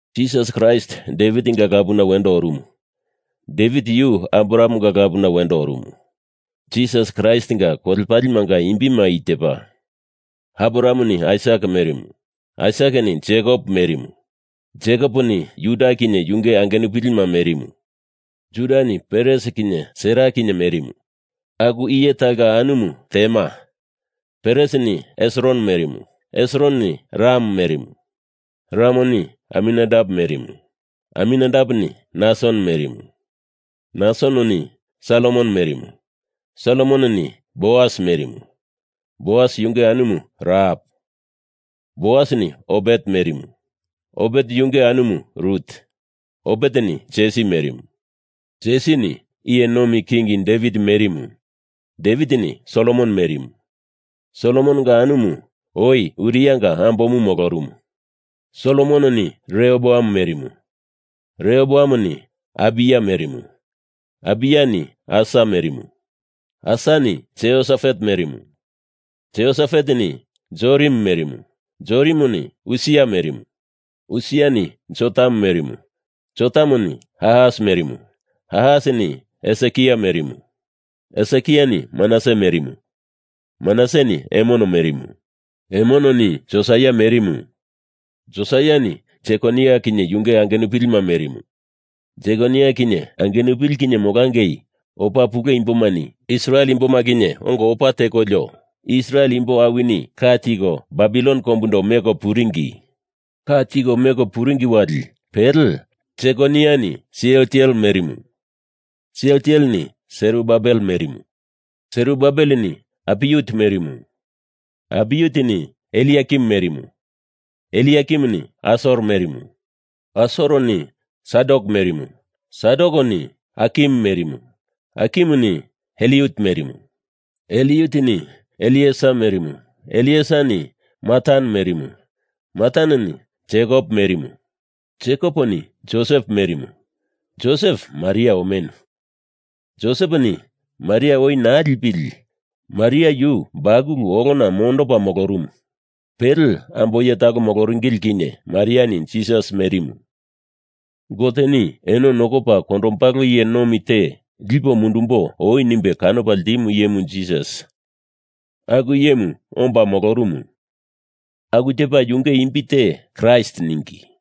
Jisas Kraist Devitinga lapuna wendo orumu. Devit yu Abrahamenga lapuna wendo orumu. Jisas Kraistinga kolepalemanga imbima i tepa: Abrahameni Aisak merimu; Aisakeni Jekop merimu; Jekoponi Juda kinye yunge angenupilima merimu; Judani Peres kinye Sera kinye merimu, aku iye talonga anumu Temar; Peresini Hesron merimu; Hesrononi Ram merimu; Ramoni Aminadap merimu; Aminadapeni Nason merimu, Nasononi Salmon merimu, Salmononi Boas merimu, Boas yunge anumu Rahap; Boasini Obet merimu, Obet yunge anumu Rut; Obeteni Jesi merimu; Jesini iye nomi king Devit merimu. Devitini Solomon merimu. Solomononga anumu oi Urianga ambomu molorumu. Solomononi Rehoboam merimu; Rehoboamoni Abiya merimu; Abiyani Asa merimu; Asani Jehosafat merimu; Jehosafateni Jorim merimu; Jorimoni Usia merimu; Usiani Jotam merimu; Jotamoni Ahas merimu; Ahasini Hesekia merimu; Hesekiani Manase merimu Manaseni Emon merimu. Emononi Josaia merimu; Josaiani Jekonia kinye yunge angenupilima merimu. Jekonia kinye angenupili kinye molangei opa pule imbomani Israel imboma kinye ongo opa tekolio Israel imbo awini ka tiko Babilon kombundo meko puringi. Ka tiko meko puringi wali pele Jekoniani Sealtiel merimu; Sealtieleni Serubabel merimu; Serubabeleni Apiuti merimu; Apiutini Eliakim merimu; Eliakimuni Asor merimu; Asoreni Sadok merimu; Sadokeni Akim merimu; Akimuni Eliut merimu; Eliutini Elieser merimu; Elieserani Matan merimu; Mataneni Jekop merimu; Jekoponi Josep merimu. Josep Maria omenu. Joseponi Maria oi naa lipili Maria yu bakulu olona mondopa molorumu. Pele ambo iye talo moloringili kinye Mariani Jisas merimu. Goteni eno nokopa kondombalo iye nomi te lipo mundumbo oi nimbe kanopa ltimu iyemu Jisas aku iyemu omba molorumu. Aku tepa yunge imbi te Kraist ningi.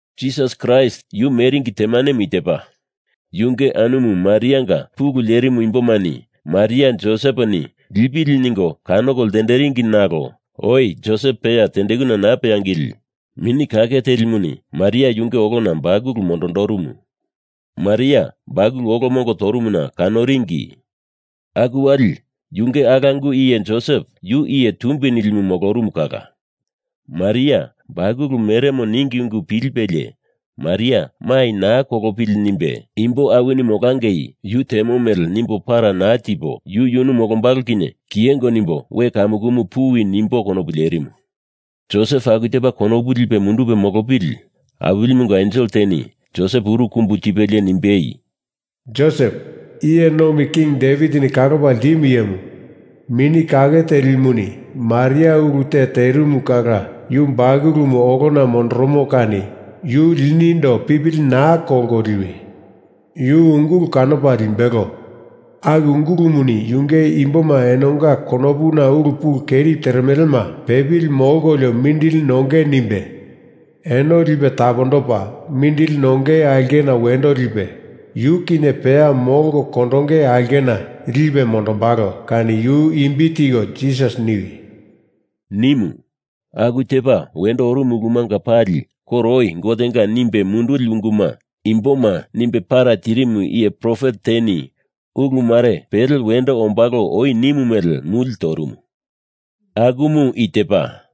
Jisas Kraist, yu meringi temanemu i tepa: Yunge anumu Marianga pulu lerimu imbomani Maria Joseponi lipili ningo kanoko ltenderingi nalo oi Josep peya tendekuna naa peangili Mini Kake Telimuni Maria yunge olona bakulu mondondorumu. Maria bakulu olo mongo torumuna kanoringi. Aku wali yunge alangu iye Josep yu iye tumbi nilimu molorumu kala Maria bakulu meremo ningi ungu pilipelie Maria mai naa kolopili nimbe imbo awini molangei yu temo mele nimbo para naa tipo yu yunu molombalo kinye kiyengo nimbo we kamukumu puwi nimbo konopu lerimu. Josep aku tepa konopu lipe mundupe molopili Awilimunga ensel teni Josep uru kumbu tipelie nimbei, “Josep, iye nomi king Devitini kalopa ltimu iyemu, Mini Kake Telimuni Maria ulu te terimu kala yu bakulumu olona mondoromo kani yu linindo pipili naa kolko liwi. Yu ungulu kanopa limbelo. Aku ungulumuni yunge imboma enonga konopuna ulu pulu keri teremelema pepili molkolio mindili nonge nimbe eno lipe tapondopa, mindili nongei aulkena wendo lipe, yu kinye peya molko kondonge aulkena lipe mondombalo kani yu imbi tiko Jisas niwi,” nimu. Aku tepa wendo orumu ulumanga pali koro oi Gotenga nimbe munduli unguma imboma nimbe para tirimu iye profet teni ulu mare pele wendo ombalo oi nimu mele muli torumu. Akumu i tepa: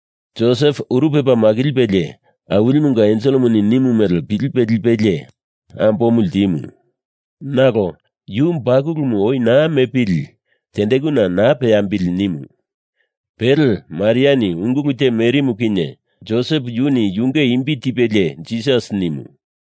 Josep uru pepa makilipelie Awilimunga enselemuni nimu mele pilipe lipelie ambomu ltimu. Nalo yu bakulumu oi naa mepili tendekuna naa peambili nimu. Pele Mariani ungulu te merimu kinye Josep yuni yunge imbi tipelie Jisas nimu.